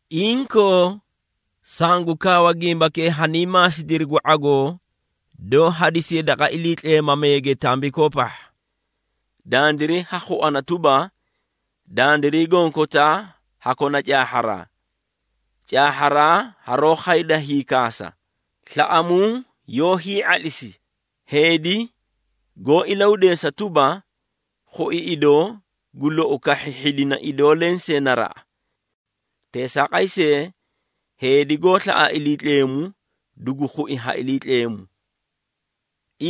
Inkoo, sangu kaawa gimbakee hanii maasidiri gu ⁄agoo doó hadisiye daqa iliitleemameege tambikoo pahha. Dandiray ha khuana tuba, “Dandiray gonkotaa ha kona caahharaa.” Caahharaa haroó khayda hiiakhasa. Slaꞌamuu yoó hii⁄atlisi. Heedi goó ilahudeesa tuba, khui idoo, gu lou kahhi hhidina idoo lensee naraꞌa. Teesaaqay see, heedi goó slaꞌa Iliitleemu, dugu khui ha Iliitleemu.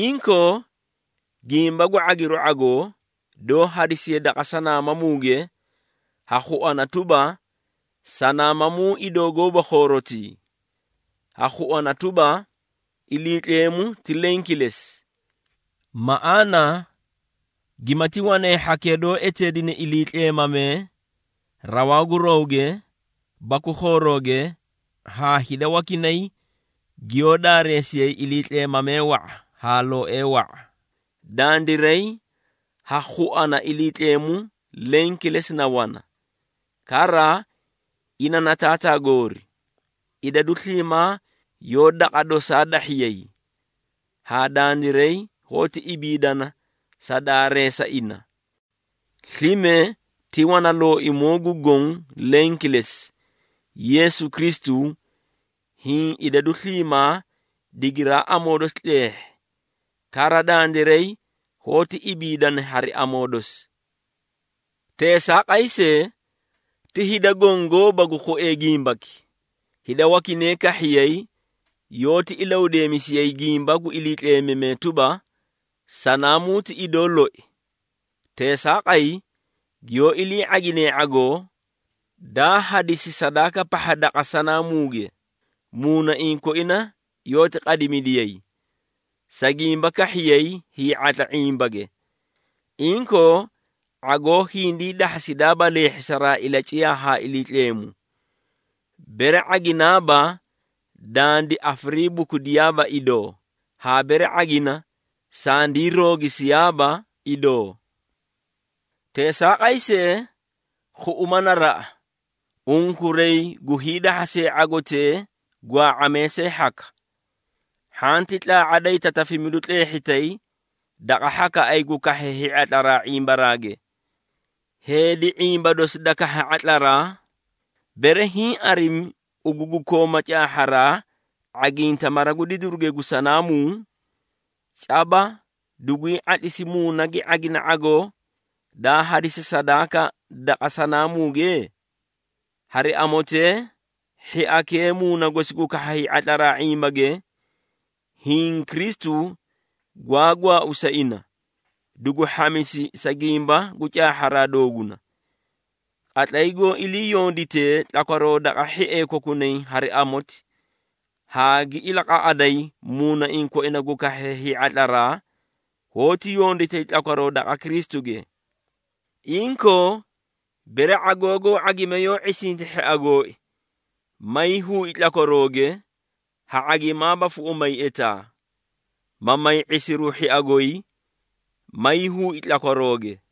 Inkoo, gimba gu ⁄agiru ⁄agoo, doó hadisiye daqa sanaamamuuge, ha khuana tuba, “Sanaamamuu idoo gooba khoorotii ha khuana tuba, ‘Iliitleemu ti leẽ kilesi.’” Maꞌaana gimati wanay hhakee doó eteedine iliitleemamee, rawaa gu rawge baku khoorooge, haa hida wakinay giyoó daareesiyay iliitleemamee wa⁄a haa looee wa⁄a, dandiray ha khuana Iliitleemu leẽ kilesi na wana. Kara, ina na Taataa goori. Idadu sliimaa yoó daqa dosaa dahhiyay, haa dandiray hoóti ibiidana sa daareesa ina. Slime ti wana Looimoo gu Goõ leẽ kilesi, Yeesu Kristu, hiĩ idadu sliimaa digiraa amoo dosi tleehhi. Kara, dandiray hoóti ibiidana hari amoo dosi. Teesaaqay see, ti hida goõ gooba gu khuee gimbaki. Hida wakinay kahhiyay yoóti ilahudeemisiyay gimba gu iliitleemamee tuba, sanaamuu ti idoo loi. Teesaaqay, giyoó ilii ⁄aginee ⁄agoo, daa hadisi sadaaka pahha daqa sanaamuuge, muunaiĩ koina yoóti qadimidiyay, sa gimba kahhiyay hii⁄atla ⁄imbage. Inkoo, ⁄agoo hindii dahhasidaaba leehhisaraa ilaciyaa haa Iliitleemu. Bere ⁄aginaaba, dandi afariibukudiyaa idoo, haa bere ⁄agina, sandii roogisiyaaba idoo. Teesaaqay see, khuꞌuma naraꞌa, unkuray gu hiidahhasee ⁄agotee gwaa⁄amee see hhaka. Hhanti tlaa⁄a da hiitatafimidu tleehhitay daqa hhakaꞌay gu kahhee hii⁄atlaraa ⁄imbaraage. Heedi ⁄imba dosi da kahha ⁄atlaraa, bere hiĩ arimi ugu gu kooma caahharaa ⁄aginta mara gu didiruge gu sanaamuu, caba duguy ⁄atlisi muuna gi ⁄agina ⁄agoo, daa hadisi sadaaka daqa sanaamuuge? Hari amotee, hhiakee muuna gosi gu kahha hii⁄atlara ⁄imbage, hiĩ, Kristu gwaa gwaau sa ina, dugu hhamisi sa gimba gu caahharaa dooguna. Qatlay goó iliiyonditee tlakwaroo daqa hhiee kokunay hari amoti, haa gi ilaqaꞌaday muunaiĩ koina gu kahhee hii⁄atlaraa, hoóti yonditay tlakwaroo daqa Kristuge. Inkoo, bere ⁄agoo goó ⁄agime yoó ⁄isinta hhia gooi, may huui tlakwarooge, ha ⁄agimaaba fuꞌumay etaa, ma may ⁄isiru hhia goy, may huui tlakwarooge.